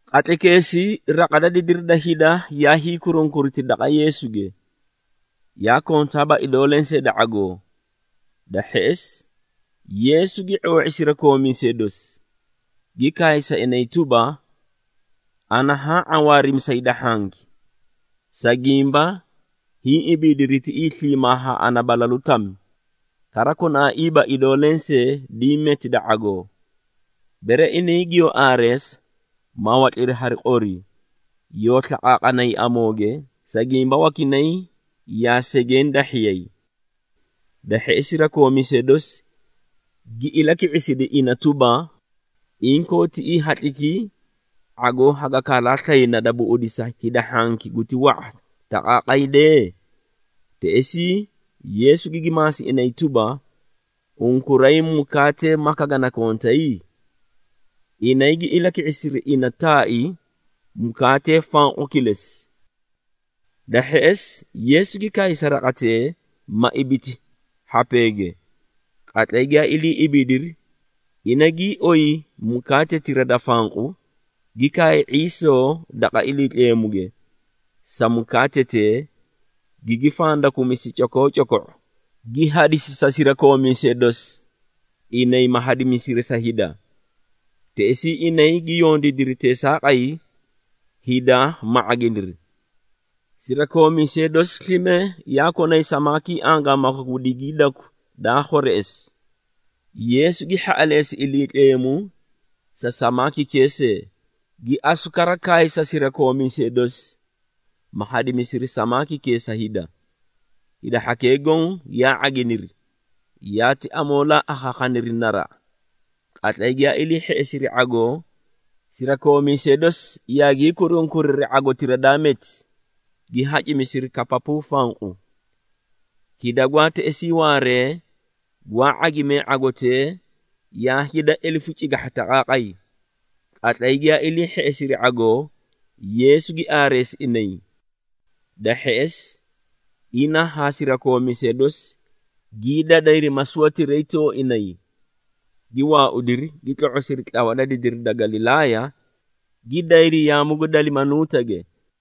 Qatlaykeesii raqa da didiri da hida yaa hiikurunkuriti daqa Yeesuge, yaa kontaaba idoo lensee da ⁄agoo. Da hheꞌesi, Yeesu gi ⁄oo⁄i sirakoomiisee dosi, gi kaay sa inay tuba, “Ana haã ⁄awaarimi sa hida hhanki, sa gimba hiĩ ibiidiri tiꞌii sliimaa haa ana balalu tami, kara konaaiiba idoo lensee diĩ meti da ⁄agoo. Bere inay giyoo aareesa, ma watliri hari qori, yoo slaqaaqanay amooge, sa gimba wakinay yaa segeẽ dahhiyay.” Da hheꞌesi, sirakoomiisee dosi gi ilaki⁄isidi ina tuba, “Inkoo tiꞌii hatlikii ⁄agoo haga kaalaa slayna da buꞌudisa hida hhanki guti wa⁄a taqaaqay dee?” Teꞌesii, Yeesu gigi maasi inay tuba, “Unkuray mukaatee maka gana kontay?” Inay gi ilaki⁄isiri ina taai, “Mukaatee fanqu kilesi.” Da hheꞌesi, Yeesu gi kaay sa raqatee, ma ibiti hhapeege. Qatlay giyaa ilii ibiidiri, ina gii oyi mukaatetira da fanqu, gi kaay ⁄iisoo daqa Iliitleemuge, sa mukaatetee, gigi fandakumisi cokoocoko⁄o, gi hadisi sa sirakoomiisee dosi, inay ma hadimisiri sa hida. Teꞌesii inay gi yondiidiri teesaaqay, hida ma ⁄aginiri. Sirakoomiisee dosi slime yaa konay samaakii angaamaka gu digiidaku daa khwereꞌesi. Yeesu gi hhaꞌaleesi Iliitleemu sa samaakikee see, gi asu kara kaay sa sirakoomiisee dosi, ma hadimisiri samaakikee sa hida. Hida hhakee goõ yaa ⁄aginiri, yaati amoolaa akhaakhaniri naraꞌa. Qatlay giyaa ilii hheꞌesiri ⁄agoo, sirakoomiisee dosi yaagii kurunkuriri ⁄agotira daa meti, gi hacimisiri kapapuu fanqu. Hida gwaa teꞌesii waaree, gwaa ⁄agimee ⁄agotee, yaa hida elefu cigahha taqaaqay. Qatlay giyaa ilii hheꞌesiri ⁄agoo, Yeesu gi aareesi inay. Da hheꞌesi, ina haa sirakoomiisee dosi gii dadayri masuwatiray tooinay, gi waaudiri, gi tlo⁄osiri tlawa da didiri da Galilaaya, gi dayri yaamu gu Dalimanuutage.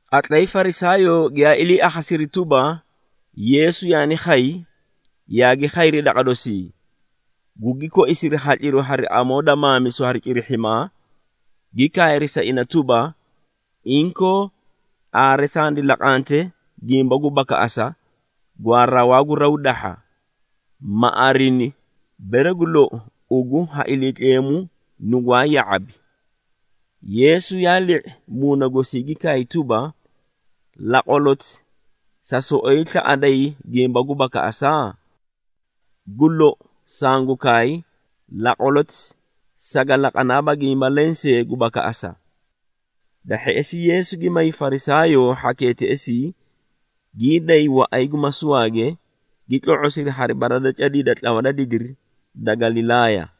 Qatlay Farisaayoo giyaa ilii akhasiri tuba, Yeesu yaani khay, yaagi khayri daqa dosii, gugi koisiri hatliru hari amoo da maamisu hari cirihhimaa, gi kaayri sa ina tuba, “Inkoo aare sandi laqante gimba gu bakaꞌasa gwaa rawaa gu raw dahha, ma arini, bere gu lou, ugu ha Iliitleemu nugwaa ya⁄abi.” Yeesu yaa li⁄i muuna gosii gi kaay tuba, “Laqwaloti sa soꞌoyi slaꞌaday gimba gu bakaꞌasa? Gu lou, sangu kaay, laqwaloti saga laqanaaba gimba lensee gu bakaꞌasa.” Da hheꞌesi, Yeesu gi may Farisaayoo hhakee teꞌesii, gii day waꞌay gu masuwaage, gi tlo⁄osiri hari bara da cadii da tlawa da didiri da Galilaaya.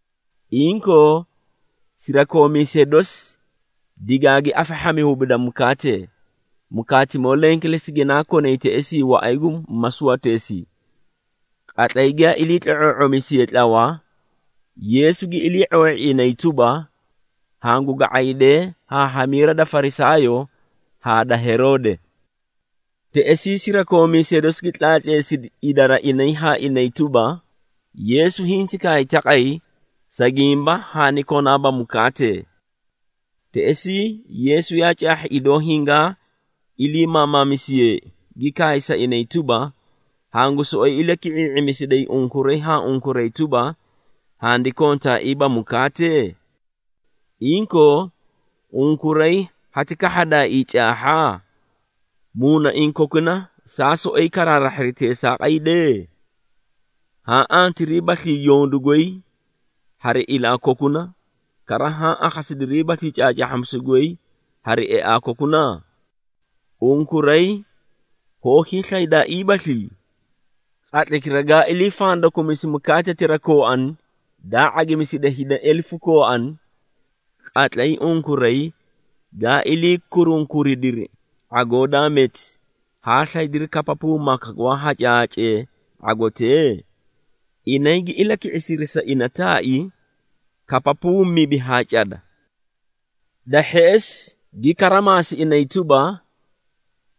Inkoo sirakoomiisee dosi digaagi afahhami hubida mukaatee, mukaatimoo leẽ kilesi ginaa konay teꞌesii waꞌay gu masuwateesii. Qatlay giyaa ilii tlo⁄oo⁄omisiyee tlawa, Yeesu gi ilii⁄oo⁄i inay tuba, “Hangu ga⁄aydee haa hamiira da Farisaayoo haa da Heroode.” Teꞌesii, sirakoomiisee dosi gi tlaatleesidi idara inay haa inay tuba, “Yeesu hinti kaay taqay, sa gimba haani konaaba mukaatee.” Teꞌesii, Yeesu yaa caahhi idoo hingaa ilii maamaamisiyeei, gi kaay sa inay tuba, “Hangu soꞌoyi ilaki⁄ii⁄imisiday unkuray haa unkuray tuba, handi kontaaiiba mukaatee? Inkoo, unkuray hati kahhadaaii caahha? Muunaiĩ kokuna saa soꞌoyi karaarahhiri teesaaqay dee? Haã antiriibaslii yondu goy hari ilaa kokuna, kara haã akhasidiriibaslii caacaahhamisu goy hari eaa kokuna? Unkuray hoó hiislaydaaiibaslii? Qatlaykira gaa ilii fandakumisi mukaatetira kooani daa ⁄agimisidi hida elefu kooani, qatlay unkuray gaa ilii kurunkuridiri ⁄agoo daa meti, haa slaydiri kapapuu maka gwaa hacaahacee ⁄agotee?” Inay gi ilaki⁄isiri sa ina taai, “Kapapuu mibi haa cada.” Da hheꞌesi, gi kara maasi inay tuba,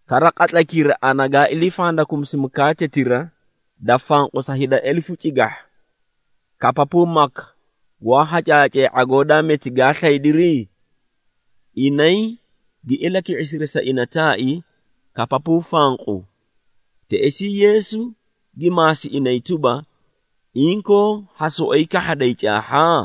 “Kara qatlaykira ana gaa ilii fandakumisi mukaatetira da fanqu sa hida elefu cigahha, kapapuu maka gwaa hacaahacee ⁄agoo daa meti gaa slaydiri?” Inay gi ilaki⁄isiri sa ina taai, “Kapapuu fanqu.” Teꞌesii, Yeesu gi maasi inay tuba, “Inkoo ha soꞌoyi kahhaday caahha?”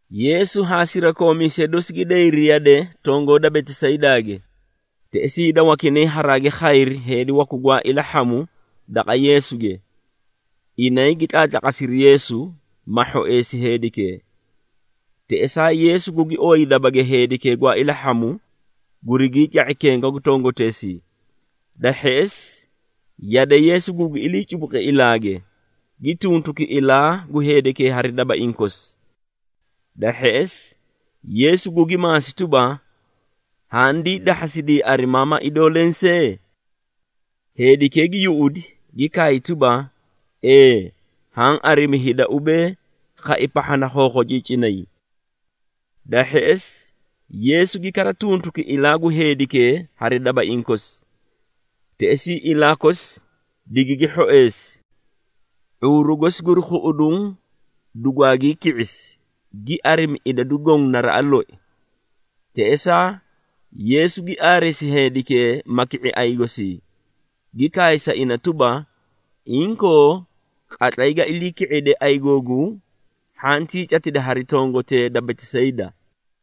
Yeesu haa sirakoomiisee dosi gi dayri yade tongoo da Betisaydaage. Teꞌesii hida wakinay haraagi khayri heedi waku gwaa ilahhamu daqa Yeesuge. Inay gi tlaatlaqasiri Yeesu, ma hhoeesi heedikee. Teꞌesaa, Yeesu gugi ooyi dabage heedikee gwaa ilahhamu, gurigii ca⁄i kenga gu tongoteesii. Da hheꞌesi, yade Yeesu gugi iliicubuqi ilaage, gi tuntuki ilaa gu heedikee hari dabaiĩ kosi. Da hheꞌesi, Yeesu gugi maasi tuba, “Handii dahhasidii arimaa ma idoo lensee?” Heedikee gi yuꞌudi, gi kaay tuba, “Ee, haã arimi hida ubee, khai pahha na khookhociicinay.” Da hheꞌesi, Yeesu gi kara tuntuki ilaa gu heedikee hari dabaiĩ kosi. Teꞌesii ilaa kosi digigi hhoeesi, ⁄uuru gosi guri khuꞌuduũ dugwaagii ki⁄isi, gi arimi idadu goõ naraꞌa loi. Teꞌesaa, Yeesu gi aareesi heedikee, ma ki⁄i ayigosii, gi kaay sa ina tuba, “Inkoo, qatlay ga ilii ki⁄ide ayigooguu, hhantii catida hari tongotee da Betisayda.”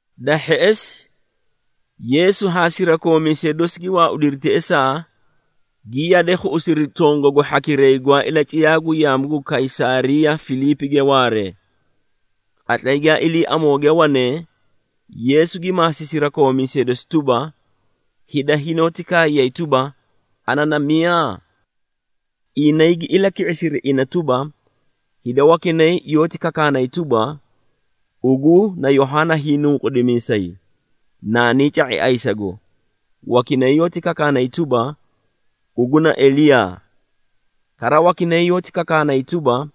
Da hheꞌesi, Yeesu haa sirakoomiisee dosi gi waaudiri teꞌesaa, gi yade khuꞌusiri tongagu hhakiray gwaa ilaciyaa gu yaamu gu Kaysaariya Filiipige waaree. Qatlay giyaa ilii amooge wanee, Yeesu gi maasi sirakoomiisee dosi tuba, “Hida hinoóti kaayay tuba, ana na miyaa?” Inay gi ilaki⁄isiri ina tuba, “Hida wakinay yoóti kakaanay tuba, ugu na Yohaana Hiinunqudimiisay, naanii ca⁄i ayisago, wakinay yoóti kakaanay tuba, ugu na Eliyaa. Kara wakinay yoóti kakaanay tuba,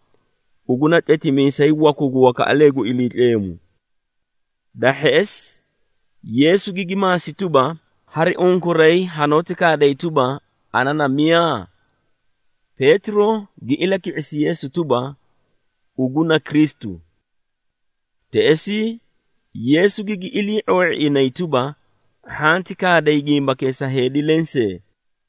ugu na tletimiisay waku gu wakaꞌalee gu Iliitleemu.” Da hheꞌesi, Yeesu gigi maasi tuba, “Hari unkuray, hanoóti kaaday tuba, ana na miyaa?” Peetiro gi ilaki⁄isi Yeesu tuba, “Ugu na Kristu.” Teꞌesii, Yeesu gigi ilii⁄oo⁄i inay tuba, “Hhanti kaaday gimbakee sa heedi lensee!”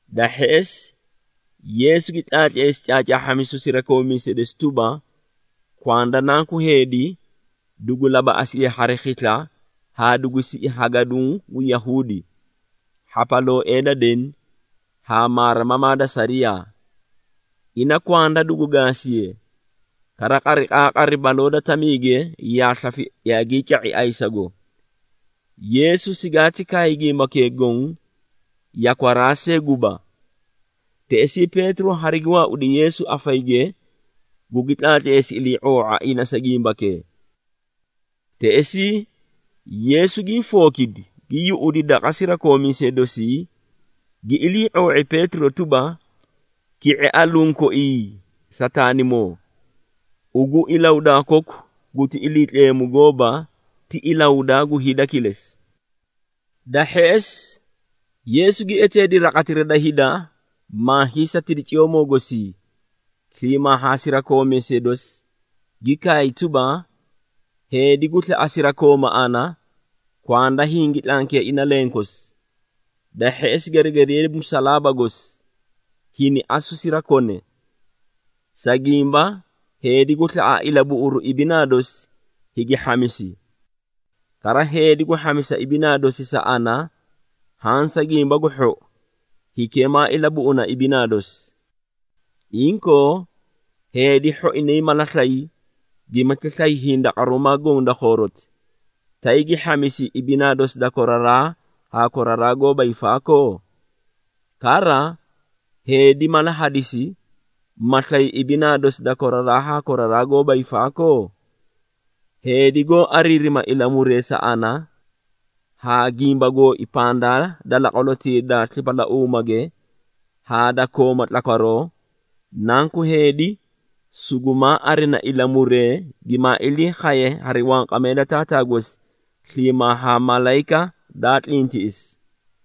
Da hheꞌesi, Yeesu gi tlaatleesi caacaahhamisu sirakoomiisee dosi tuba, kwanda Nanku Heedi, dugu labaꞌasiye hari khisla haa dugu siꞌi ha gaduũ gu Yahuudi, hhapalooee da deni haa maarimamaa da sariyaa. Ina kwanda dugu gaasiye, kara qariqaaqari, baloo da tamiige yaa slafi yaagii ca⁄i ayisago. Yeesu sigaati kaay gimbakee goõ, yakwaraa see guba. Teꞌesii Peetiro harigi waaudi Yeesu afayige, gugi tlaatleesi ilii⁄oo⁄a ina sa gimbakee. Teꞌesii, Yeesu gii fookidi, gi yuꞌudi daqa sirakoomiisee dosii, gi ilii⁄oo⁄i Peetiro tuba, “Ki⁄e aluũ koii Sataanimoo! Ugu ilahudaa koku guti Iliitleemu gooba, ti ilahudaa gu hida kilesi.” Da hheꞌesi, Yeesu gi eteedi raqatira da hida, maa hiisatidi ciyoomoo gosii, sliimaa haa sirakoomiisee dosi, gi kaay tuba, “Heedi gu slaꞌa sirakooma ana, kwanda hingi tlankiye ina lenkosi, da hheꞌesi geregediye musalaaba gosi, hini asu sirakone. Sa gimba, heedi gu slaꞌa ilabuꞌuru ibinaa dosi, higi hhamisi. Kara heedi gu hhamisa ibinaa dosi sa ana haã sa Gimba gu Hhou, hikee maa ilabuꞌuna ibinaa dosi. Inkoo, heedi hhoinay mala slay, gimati slay hindaqaruumaa goõ da khooroti, tay gi hhamisi ibinaa dosi da koraraa haa koraraa goóba hiifaakoo? Kara, heedi mala hadisi, ma slay ibinaa dosi da koraraa haa koraraa goóba hiifaakoo? Heedi goó ariirima ilamuree sa ana, haa gimba gooi pandaa da laqwalotii da slipalauumage haa da kooma tlakwaroo, Nanku Heedi, sugumaa arina ilamuree, gimaa ilii khaye hari wanqamee da Taataa gosi sliimaa haa malayika daa tlintiꞌisi.”